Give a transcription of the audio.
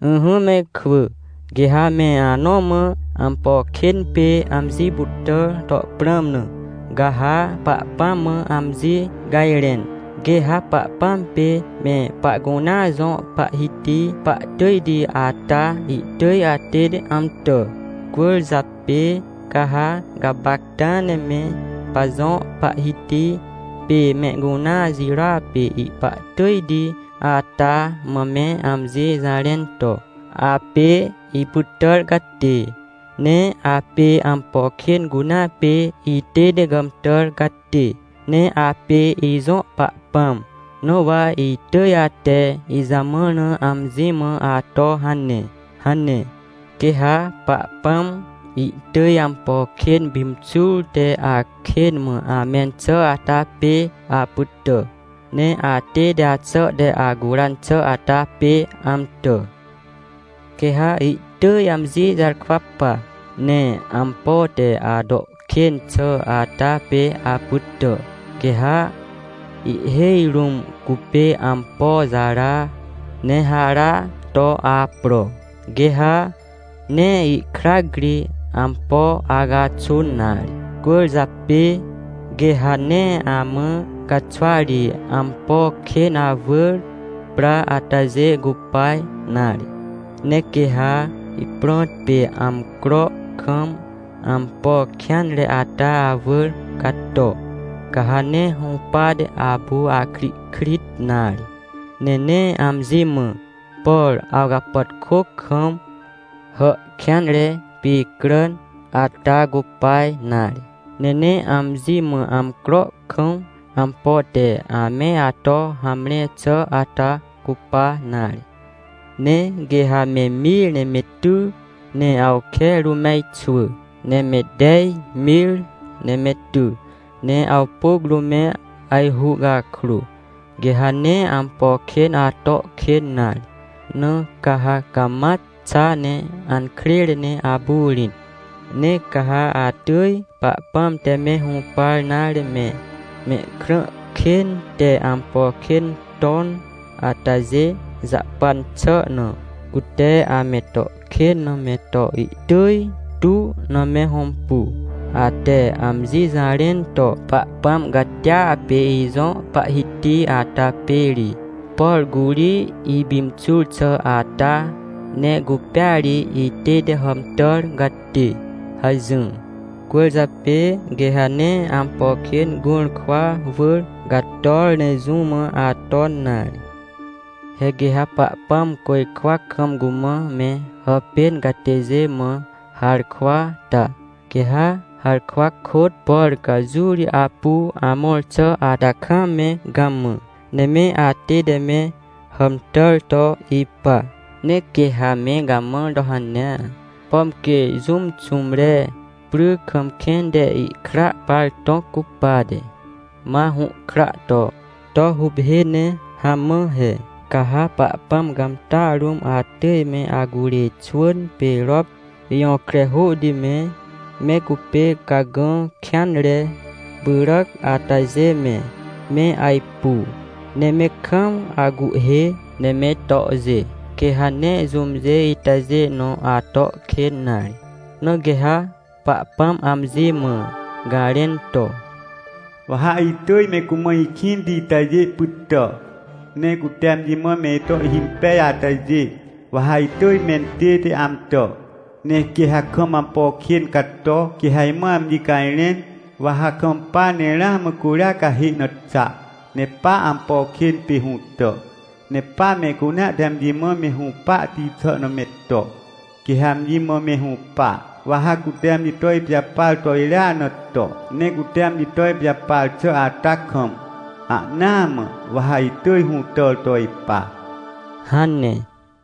Ỹhỹ me ikwỳ! Quê ha me anõ mã, ampo kên pê amji pytàr to prãm na, ca ha Pahpãm mã amji cajrẽn, quê ha Pahpãm pê me pahcunea jõ Pahhiti pahtỳjti ata, ihtỳj atête amtà. Cwỳrjapê ca ha gapacta ne me pajõ Pahhiti pê mehcunea jirôa pê ihpahtỳjti ata mã me amji jarẽn to, “Apê ipytàr catê, ne apê ampo kên cunea pê itête gàmtàr catê, ne apê ijõ Pahpãm, na wa itỳj ate ijamãr na amji mã ato hane” hane. Quê ha Pahpãm ihtỳj ampo kên pimxur te akên mã amẽn xà ata pê apytà, ne atête axà te acuran xà ata pê amtà. Quê ha ihtỳj amji jarkwa pa, ne ampo te ato kên xà ata pê apytà. Quê ha ihhêj rũm cupê ampo jara, ne hara to apro, quê ha nee ihkrac ri ampo acaxun nare. Cwỳrjapê quê ha nee amã caxwa ri ampo kên awỳr pra atajê cupa nare. Ne quê ha ihprõt pê amcro kam ampo kêanre ata awỳr cato, ca ha nee hũpate apu akrihkrit nare. Ne nee amji mã, por awcapàtkô kam, hà kêanre picràn ata cupa nare, ne nee amji mã amcro kam ampo te ame ato hamre xà ata cupa nare. Ne quê ha me mir ne me ty, ne awke rũm me ajxwỳ, ne me tej mir ne me ty, ne awpôc rũm me ajhu cakrô, quê ha nee ampo kên ato kên nare! Na ca ha cama xa ne ankrêre ne apu rĩt. Ne ca ha atỳj Pahpãm te me hũpar nare me, mehkrã kên te ampo kên ton atajê jahpan xà na, cute ame to kên na me to ihtỳj tu na me hõmpu. Ate amji jarẽn to: “Pahpãm catia pê ijõ Pahhiti ata pê ri, por curi ipimxur xà ata, ne cupêa ri itête hàmtàr catê!” hajỹr. Cwỳrjapê quê ha nee ampo kên gũrkwa wỳr cator ne jũ mã aton nare. He quê ha Pahpãm côjkwa kam cumã me hàpên catêjê mã harkwa ta, quê ha harkwa kôt, por ca jũ ri apu amõr xà ata kam me gamã, ne me atête me hàmtàr to ipa. Ne quê ha me gamãr to hanea, pom quê jũm xũmre pry kam kẽn te ihkra par tõc cupate, ma hũhkra to, to huphê ne hamã he. Ca ha Pahpãm cãmtàa rũm atỳj me acurê xwỳn pê rop jõkre hôhti me, me cupê cagã kêanre pyràc atajê me, me ajpu, ne me kam acuhhê, ne me tohjê. Quê ha nee jũmjê itajê nõ ato kên nare. Na quê ha Pahpãm amji mã garẽn to: “Wa ha itỳj me cumã ikĩnti itajê pytà. Ne cute amji mã me ito ihhimpej atajê, wa ha itỳj mentête amtà! Ne quê ha kam ampo kên cato, quê ha imã amji cajrẽn, wa ha kampa ne ramã curia cahê na xa, ne pa ampo kên pê hũtà, ne pa mehcunea te amji mã me hũpahti xà na me to, quê ha amji mã me hũpa. Wa ha cute amji to ipijapar to irya na to, ne cute amji to ipijapar xà ata kam, ahnaa mã, wa ha itỳj hũtàr to ipa” hane.